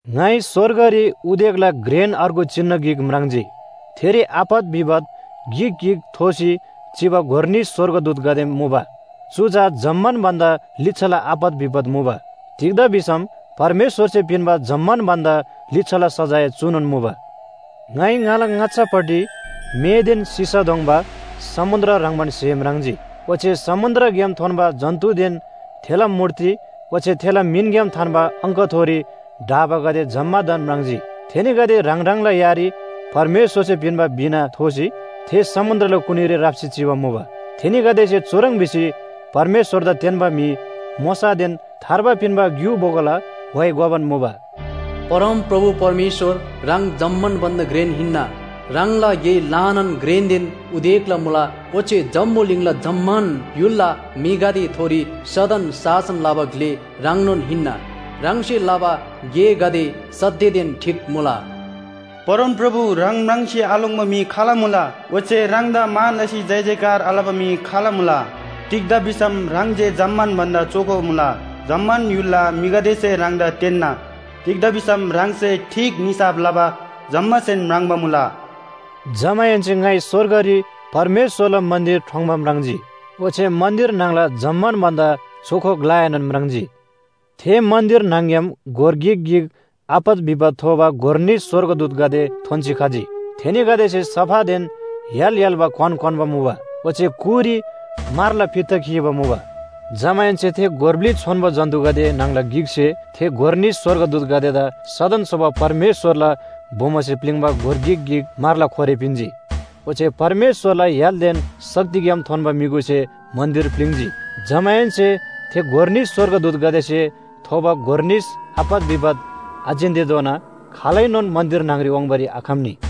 ङाइ स्‍वर्गरी उदेकला घ्रेन अर्गु चिनु गिक म्राङ्जी। थेरी आपत विपत गिक गिक थोसी चिबा गोर निस स्‍वर्गदूतगदे मुबा। चु चा जम्‍मान भन्‍दा लिच्‍छाला आपत विपत मुबा। तिग्‍दा भिसम परमेश्‍वरसे पिन्‍बा जम्‍मान भन्‍दा लिच्‍छाला सजाय चुनोन मुबा। ङाइ ङाला ङाच्‍छापट्टि मेदेन सिसा दोङ्बा समुन्‍द्र ह्रङ्‌बान स्‍हे म्राङ्जी। ओच्‍छे समुन्‍द्रग्‍याम थोन्‍बा जन्‍तुदेन थेला मूर्ति ओच्‍छे थेला मिनग्‍याम थान्‍बा अङ्कथोरी ढाबागदे जम्‍मादान म्राङ्जी। थेनीगदे ह्राङ ह्राङला यारी परमेश्‍वरसे पिन्‍बा वीणा थोसी थे समुन्‍द्रला कुनीरी राप्‍सी चिबा मुबा। थेनीगदेसे चुह्रङ् भिसी परमेश्‍वरदा तेन्‍बा म्‍हि मोशादेन थार्बा पिन्‍बा ग्‍यु बोगोला व्‍हाइ गोबान मुबा, “परमप्रभु परमेश्‍वर ह्राङ जम्‍मान भन्‍दा घ्रेन हिन्‍ना, ह्राङला गे ल्‍हानान घ्रेनदेन उदेकला मुला, ओच्‍छे जम्‍बुलिङला जम्‍मान य्‍हुलला म्‍हिगदेथोरी सदन शासन लबा ग्‍ले ह्राङनोन हिन्‍ना, ह्राङसे लबा गेगदे सत्‍यदेन ठीक मुला। परमप्रभु ह्राङ म्राङ्सी आलोङ्‌बा म्‍हि खाल मुला? ओच्‍छे ह्राङदा मान लसी जयजयकार आलबा म्‍हि खाल मुला? तिग्‍दा भिसम ह्राङ जे जम्‍मान भन्‍दा चोखो मुला। जम्‍मान य्‍हुलला म्‍हिगदेसे ह्राङदा तेन्‍ना, तिग्‍दा भिसम ह्राङसे ठीक निसाफ लबा जम्‍मासेन म्राङ्बा मुला।” जमाहेन्‍से ङाइ स्‍वर्गरी परमेश्‍वरला मन्‍दिर ठोङ्‌बा म्राङ्जी, ओच्‍छे मन्‍दिर न्‍हङला जम्‍मान भन्‍दा चोखो ग्‍लाएनोन म्राङ्जी। थे मन्‍दिर न्‍हङ‍ग्‍याम गोर गिक गिक आपत विपत थोबा गोर निस स्‍वर्गदूतगदे थोन्‍सी खजी। थेनीगदेसे सफादेन य्‍हाल य्‍हाल्‍बा क्‍वान क्‍वान्‍बा मुबा, ओच्‍छे कुरी म्‍हरला फित्ता खीबा मुबा। जमाहेन्‍से थे गोर ब्‍लि छोन्‍बो जन्‍तुगदे न्‍हङला गिकसे थे गोर निस स्‍वर्गदूतगदेदा सदन सोबा परमेश्‍वरला बोमोसे प्‍लिङ्बा गोर गिक गिक म्‍हरला खोरे पिन्‍जी। ओच्‍छे परमेश्‍वरला य्‍हालदेन शक्तिग्‍याम थोन्‍बा म्‍युगुसे मन्‍दिर प्‍लिङ्‌जी। जमाहेन्‍से थे गोर निस स्‍वर्गदूतगदेसे थोबा गोर निस आपत विपत आजिन्‍तेधोना खालैनोन मन्‍दिर न्‍हङरी वाङ्बारी आखम्‍नी।